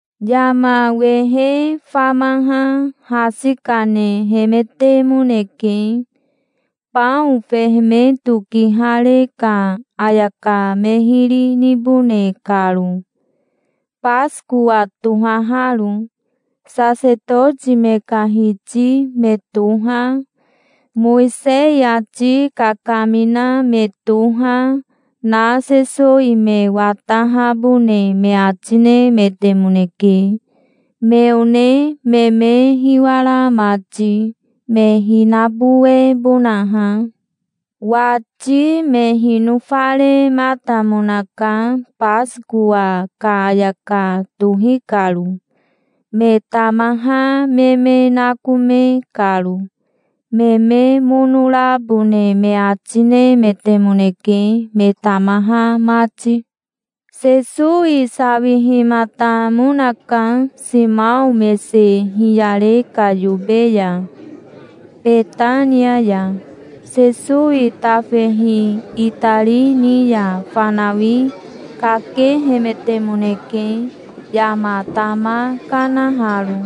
Yama wehe famaha hasi kanehemetemoneke, bao fehemeto kihare ka ayaka me hiri nibone karo, Basikowa tohaharo. Sasetoti me ka hiti me toha, Mowisei ati kakamina me toha, na Sesowi me watahabone me ati nemetemoneke, me one me me hiwara mati, me hinabowebonaha. Wati me hinofarematamonaka Basikowa ka ayaka tohi karo, me tamaha me me nakome karo. Me me mono rabone me ati nemetemoneke, me tamaha mati. Sesowi sawihimatamonaka Simao mese hiyare ka yobe ya, Betania ya. Sesowi tafehi itari ni ya fanawi kakehemetemoneke, yama tama kanaharo,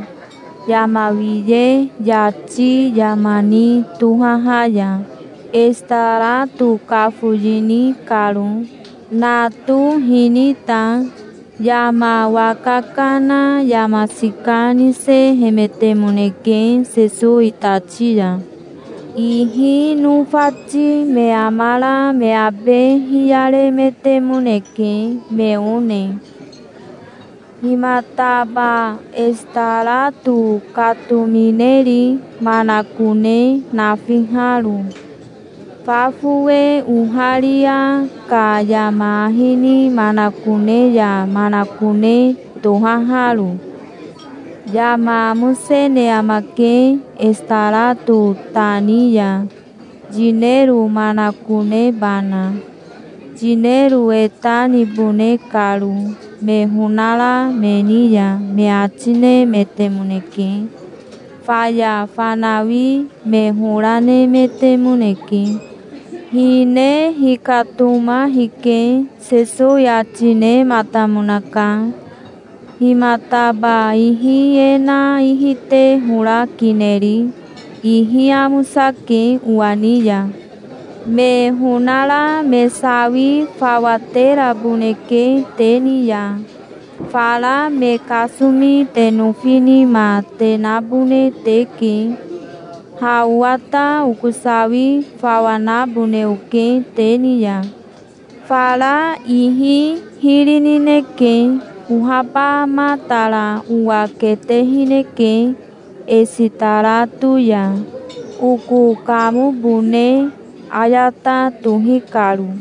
yama wiye yati yama ni tohaha ya, esitarato kafoyini karo, nato hinita. Yama waka kana yama sika nisehemetemoneke, Sesowi tati ya. Ihi nofati me amara me abe hiyaremetemoneke, me one. "Himataba esitarato katomineri, manakone nafiharo, fa fowe oharia ka yama ahi ni manakone ya manakone tohaharo? Yama amosene amake, esitarato ta ni ya, yinero manakonebana, yinero e ta nibone karo me honara me ni ya", me ati nemetemoneke. Faya fanawi me hora nemetemoneke. "Hine hikatoma hike", Sesowi ati nematamonaka. "Himataba ihi e na ihi te hora kineri? Ihi amosake owa ni ya. Me honara me sawi fawa teraboneke te ni ya. Fara me kasomi te nofi nima te nabone teke. Ha owa ta oko sawi fawa nabone oke te ni ya. Fara ihi hiri nineke. Ohabamatara owa ketehineke esitarato ya, oko kamobone ayata tohi karo.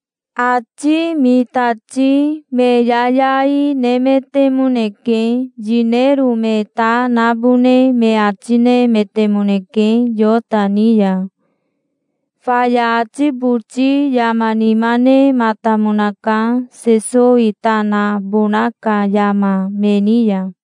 Ati mitati me yayai nemetemoneke. Yinero me ta nabone me ati nemetemoneke Yota ni ya. Faya ati boti yama nima nematamonaka, Sesowi ta nabona ka yama, me ni ya.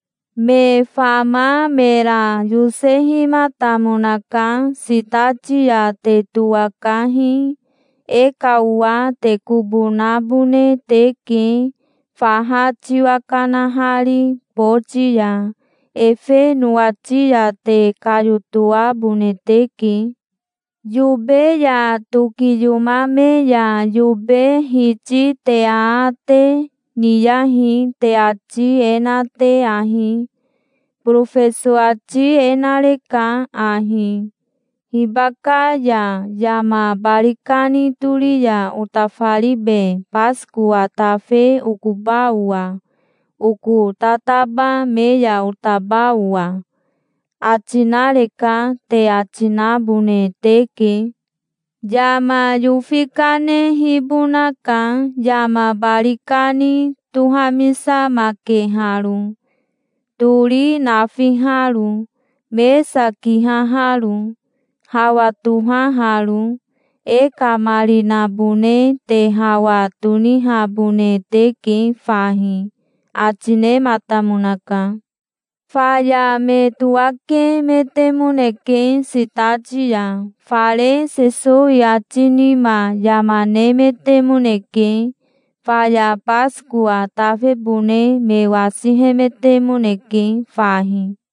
Me fama mera yosehimatamonaka. "Sitati ya te towakahi. E ka owa te kobo nabone teke, faha tiwa kanahari boti ya. Efe nowati ya te kayotoabone teke. Yobe ya tokiyomame ya yobe hiti te aate niyahi, te ati e na te ahi: 'Borofeso ati e nareka ahi: "Hibaka ya yama bari kani tori ya otafaribe Basikowa tafe okoba owa, oko tataba me ya otaba owa?" ati nareka', te ati nabone teke. Yama yofi kanehibonaka, yama bari kani tohamisamakeharo, tori nafiharo, mesa kihaharo, hawa tohaharo. E ka marinabone te hawa tonihabone teke fahi", ati nematamonaka. Faya me towakemetemoneke sitati ya. Fare Sesowi ati nima yama nemetemoneke. Faya Basikowa tafebone me wasihemetemoneke fahi.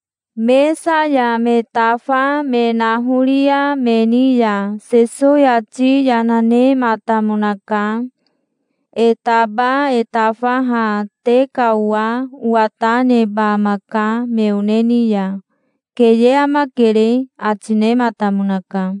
Mesa ya me tafa me nahoria me ni ya Sesowi ati yana nematamonaka. "E taba e tafaha te ka owa owa ta neba amaka me one ni ya. Keye amakere", ati nematamonaka.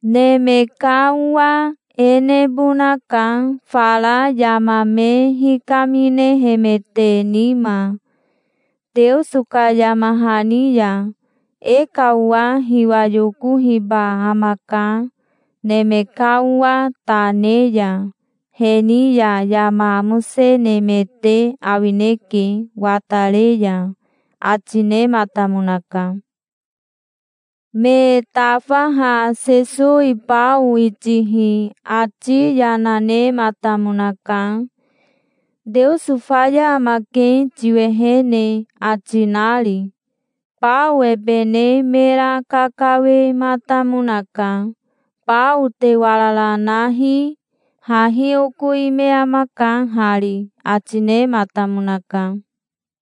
Neme ka Owa e nebonaka, fara yama me hikaminehemete nima, Teoso ka yama hani ya. E ka owa hiwa yokohiba amaka, Neme ka Owa ta ne ya. He ni ya yama amosenemete awineke, watare ya", ati nematamonaka. Me tafaha Sesowi bao itihi ati yana nematamonaka, "Teoso faya amake tiwehene", ati nari. Bao ebe ne mera kakawematamonaka. "Bao te warara nahi. Hahi oko ime amaka hari", ati nematamonaka.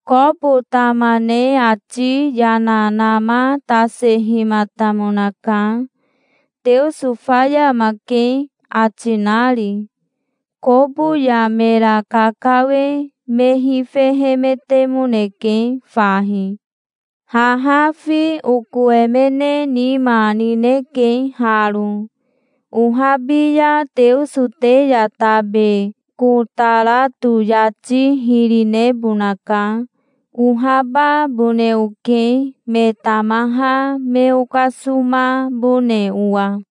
Kobo tama ne ati yana namatasehimatamonaka, "Teoso faya amake", ati nari. Kobo ya mera kakawe me hifehemetemoneke fahi. "Haha fi oko emene nima nineke haro. Ohabi ya Teoso te ya tabe kotarato yati hiri nebonaka. Ohababone oke, me tamaha me okasomabone owa.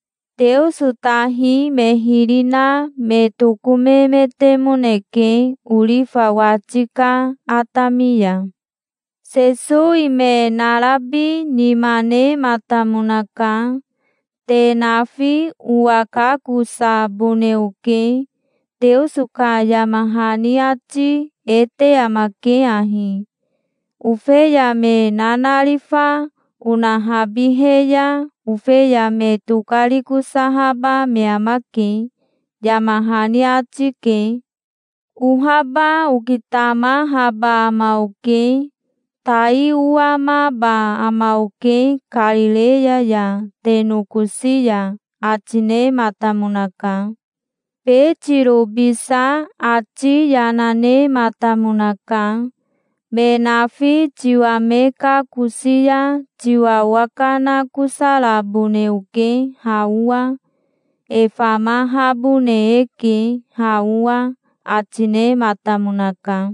Teoso tahi me hiri na me tokomemetemoneke orifa wati ka atami ya. Sesowi me narabi nima nematamonaka. "Te nafi owa kakosabone oke. Teoso ka yama hani ati e te amake ahi: 'Ofeya me nanarifa onahabihe ya ofeya me tokarikosahaba me amake', yama hani ati ke. Ohaba okitamahaba ama oke. Tai owamaba ama oke Karireya ya, te nokosi ya", ati nematamonaka. Betirobisa ati yana nematamonaka. "Me nafi tiwa me kakosi ya tiwa owakanakosarabone oke, ha owa. E famahabone eke, ha owa", ati nematamonaka.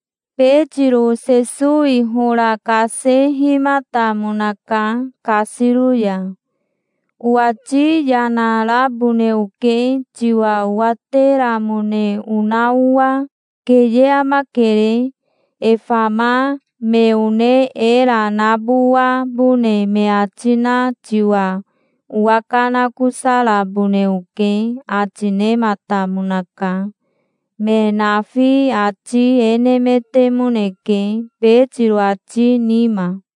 Betiro Sesowi hora kasehimatamonaka kasiro ya. "Owati yana rabone oke, tiwa owateramone ona owa. Keye amakere. E fama me one era nabowabone me ati na tiwa owakanakosarabone oke", ati nematamonaka. Me nafi ati e nemetemoneke, Betiro ati nima.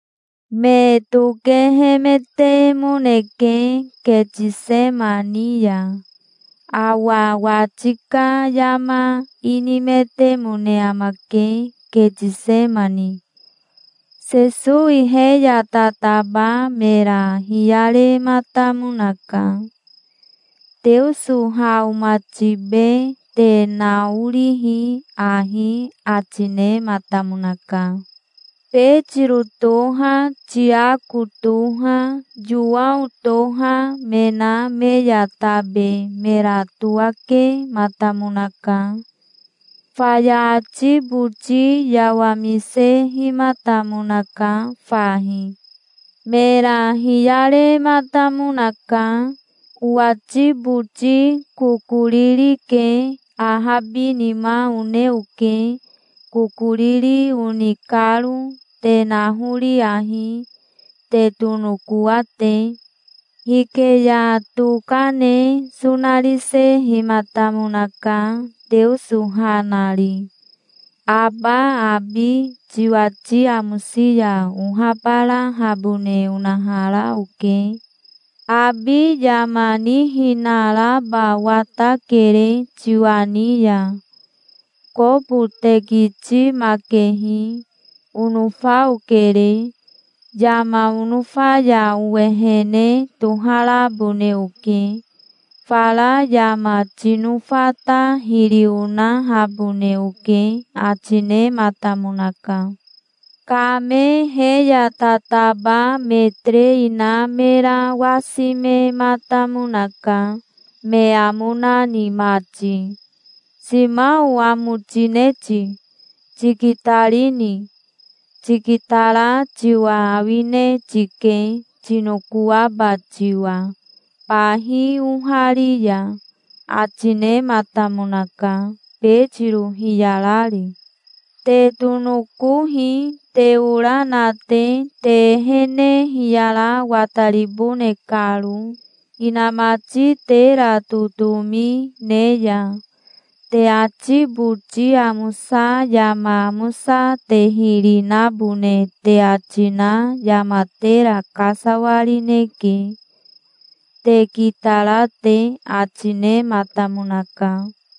Me tokehemetemoneke Ketisemani ya. Awa wati ka yama inimetemone amake, Ketisemani. Sesowi he ya tataba mera hiyarematamonaka. "Teoso ha omatibe. Te naorihi ahi", ati nematamonaka. Betiro toha, Tiako toha, Yowao toha, me na me ya tabe mera towakematamonaka. Faya ati boti yawamisehimatamonaka fahi. Mera hiyarematamonaka. "Owati boti kokoriri ke. Ahabinima one oke, kokoriri oni karo. Te nahori ahi, te tonokoa te". Hike ya toka ne sonarisehimatamonaka, Teoso ha nari. "Aba abi tiwati amosi ya ohabarahabone onahara oke. Abi yama nihinaraba watakere tiwa ni ya. Kobo tekitimakehi, onofa okere. Yama onofa ya owehene toharabone oke. Fara yama tinofa ta hiri onahabone oke", ati nematamonaka. Kame he ya tataba me terei na mera wasimematamonaka, me amo nani mati. "Simao, amo tine ti? Tikitarini? Tikitara tiwa awine tike, tinokoaba tiwa, bahi ohari ya", ati nematamonaka, Betiro hiyarari. "Te tonokohi, te ora na te, te ehene hiyara wataribone karo, inamati tera totomi ne ya. Te ati boti amosa yama amosa te hiri nabone te ati na yama tera kasawarineke, te kitara te", ati nematamonaka.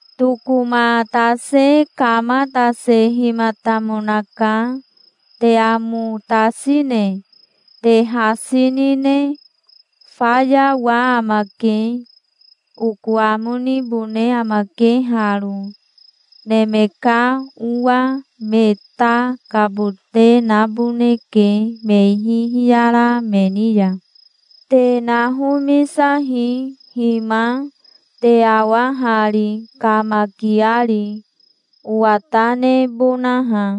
Tokomatase kamatasehimatamonaka. "Te amo tasine? Te hasi nine? Fayawa amake. Oko amo nibone amake haro. Neme ka Owa me ta kabote naboneke me ihi hiyara me ni ya. Te nahomisahi. Hima, te awa hari, kamakiari, owa ta nebonaha".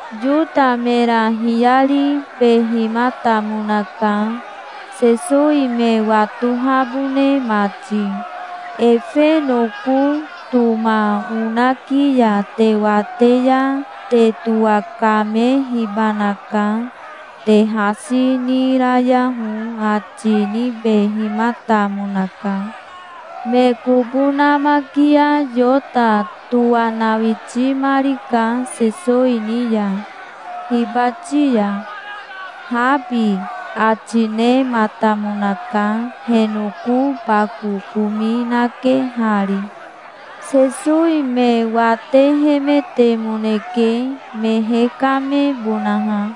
Yota mera hiyaribehimatamonaka, Sesowi me watohabone mati. "Efe noko toma onaki ya te wate ya te towakamehibanaka. Te hasi nirayaho", ati nibehimatamonaka. Me kobo namakia Yota towanawitimarika Sesowi ni ya, hibati ya. "Habi", ati nematamonaka, he noko bako komi nakehari. Sesowi me watehemetemoneke, me hekamebonaha.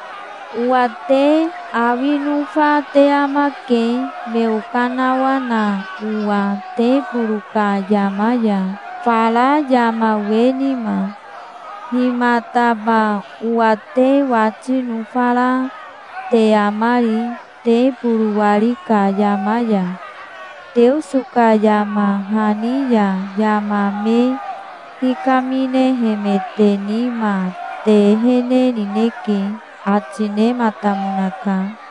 Owa te awi nofa te amake me okanawana owa teboro ka yama ya fara yama we nima. Himataba owa te wati nofara te amari, teboro wari ka yama ya? Teoso ka yama hani ya yama me hikaminehemete nima te ehene nineke", ati nematamonaka.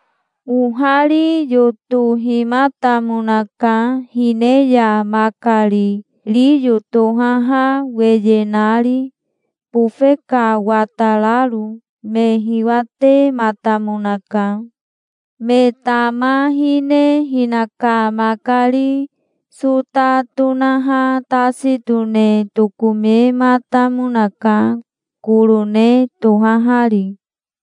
Ohari yotohimatamonaka, hine ya makari riyo tohaha weye nari, bofe ka watararo. Me hiwatematamonaka. Me tama hine hinaka makari sota tonaha tasi tone tokomematamonaka, korone tohahari.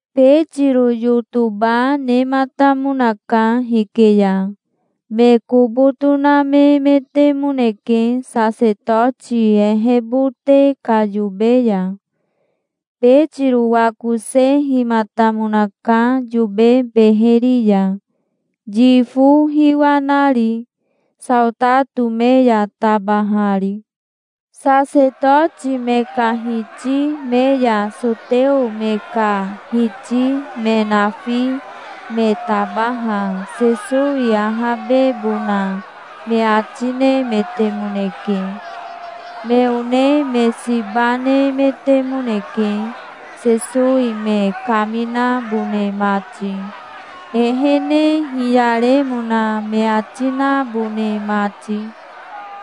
Betiro yotoba nematamonaka hike ya. Me kobo tonamemetemoneke, sasetoti ehebote ka yobe ya. Betiro wakosehimatamonaka yobe beheri ya, yifo hiwa nari, saotato me ya tabahari. Sasetoti me ka hiti me ya soteo me ka hiti me nafi me tabaha Sesowi ahabebona me ati nemetemoneke. Me one me siba nemetemoneke, Sesowi me kaminabone mati, ehene hiyaremona me ati nabone mati.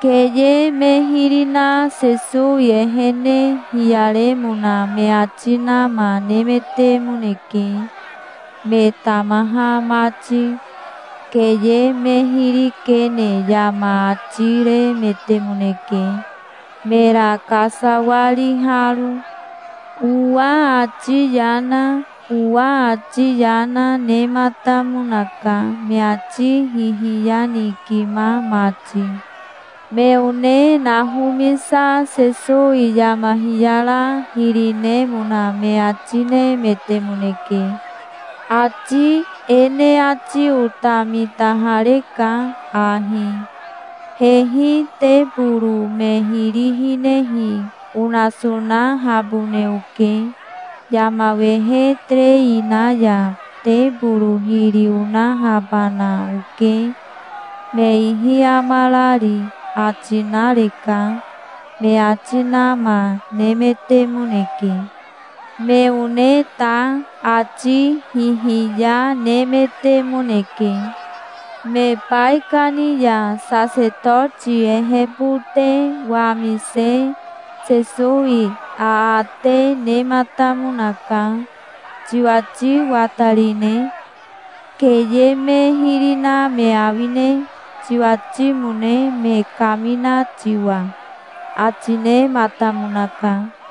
Keye me hiri na Sesowi ehene hiyaremona me ati nama nemetemoneke, me tamaha mati. Keye me hiri kene yama ati remetemoneke, mera kasawariharo. Owa ati yana, owa ati yana, nematamonaka, me ati hihiyanikima mati. Me one nahomisa Sesowi yama hiyara hiri nemona me ati nemetemoneke. "Ati e ne ati ota mitahareka ahi: 'Hehi teboro me hiri hinehi onasonahabone oke. Yama wehe terei na ya teboro hiri onahabana oke, me ihi amarari', ati nareka", me ati nama nemetemoneke. Me one ta ati hihiya nemetemoneke. Me baikani ya sasetoti ehebote wamise Sesowi aate nematamonaka. "Tiwati watarine? Keye me hiri na me awine, tiwatimone me kamina tiwa?" ati nematamonaka.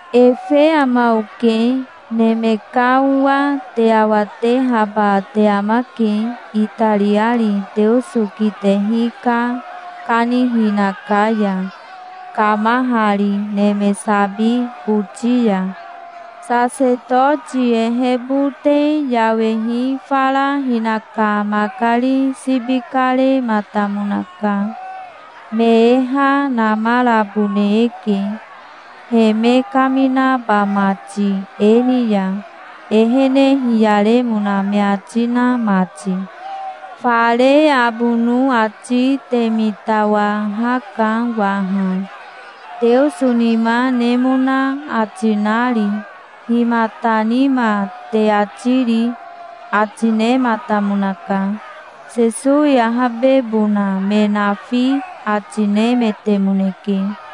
"Efe ama oke. Neme ka Owa te awatehaba te amake, itariari Teoso kitehi ka kanihina ka ya, kamahari neme sabi boti ya". Sasetoti ehebote yawehi fara hinaka makari sibi karematamonaka. "Me e ha namarabone eke, he me kaminaba mati e ni ya, ehene hiyaremona me ati na mati. Fare abono ati te mitawahaka waha, Teoso nima nemona ati nari. Himata nima te ati ri?" ati nematamonaka. Sesowi ahabebona me nafi ati nemetemoneke.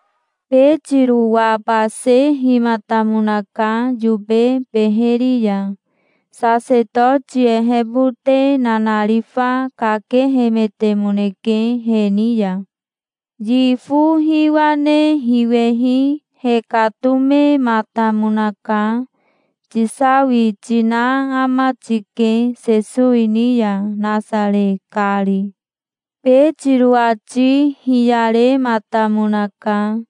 Betiro wabasehimatamonaka yobe beheri ya. Sasetoti ehebote nanarifa kakehemetemoneke he ni ya. Yifo hiwa ne hiwehi hekatomematamonaka. "Tisawi tina ama tike Sesowi ni ya, Nasare kari". Betiro ati hiyarematamonaka.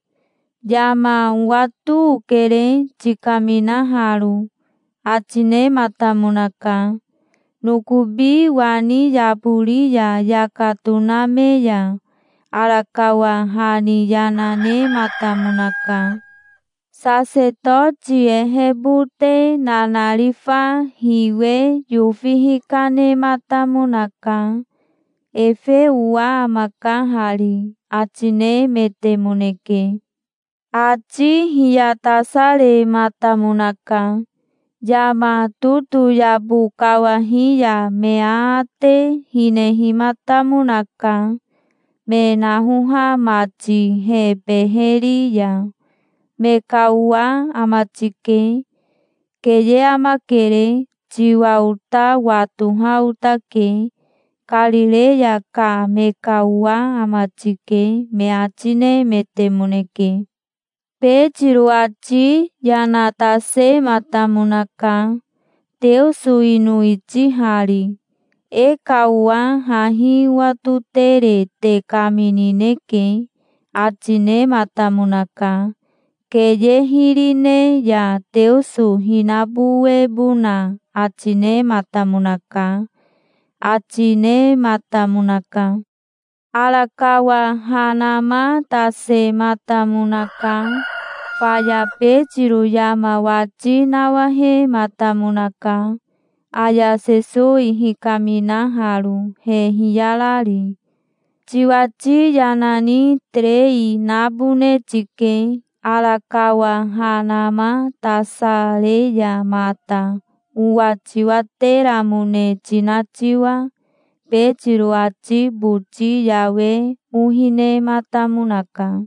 "Yama owato okere, tikaminaharo", ati nematamonaka. Nokobi wani yabori ya yaka toname ya arakawa ha ni yana nematamonaka. Sasetoti ehebote nanarifa hiwe yofi hikanematamonaka. "Efe owa amaka hari", ati nemetemoneke. Ati hiyatasarematamonaka. Yama totoyabo kawahi ya me aate hinehimatamonaka, me nahoha mati he beheri ya. "Me ka owa ama tike. Keye amakere. Tiwa ota watoha otake. Karireya ka me ka owa ama tike", me ati nemetemoneke. Betiro ati yana tasematamonaka, Teoso ino itihari. "E ka owa hahi owatotere te kaminineke", ati nematamonaka. Keye hiri ne ya Teoso hinabowebona ati nematamonaka, ati nematamonaka. Arakawa ha namatasematamonaka. Faya Betiro yama wati nawahematamonaka, aya Sesowi hikaminaharo, he hiyarari. "Tiwati yana ni terei nabone tike, arakawa ha namatasare ya mata, owa tiwateramone tina tiwa". Betiro ati boti yawe ohi nematamonaka.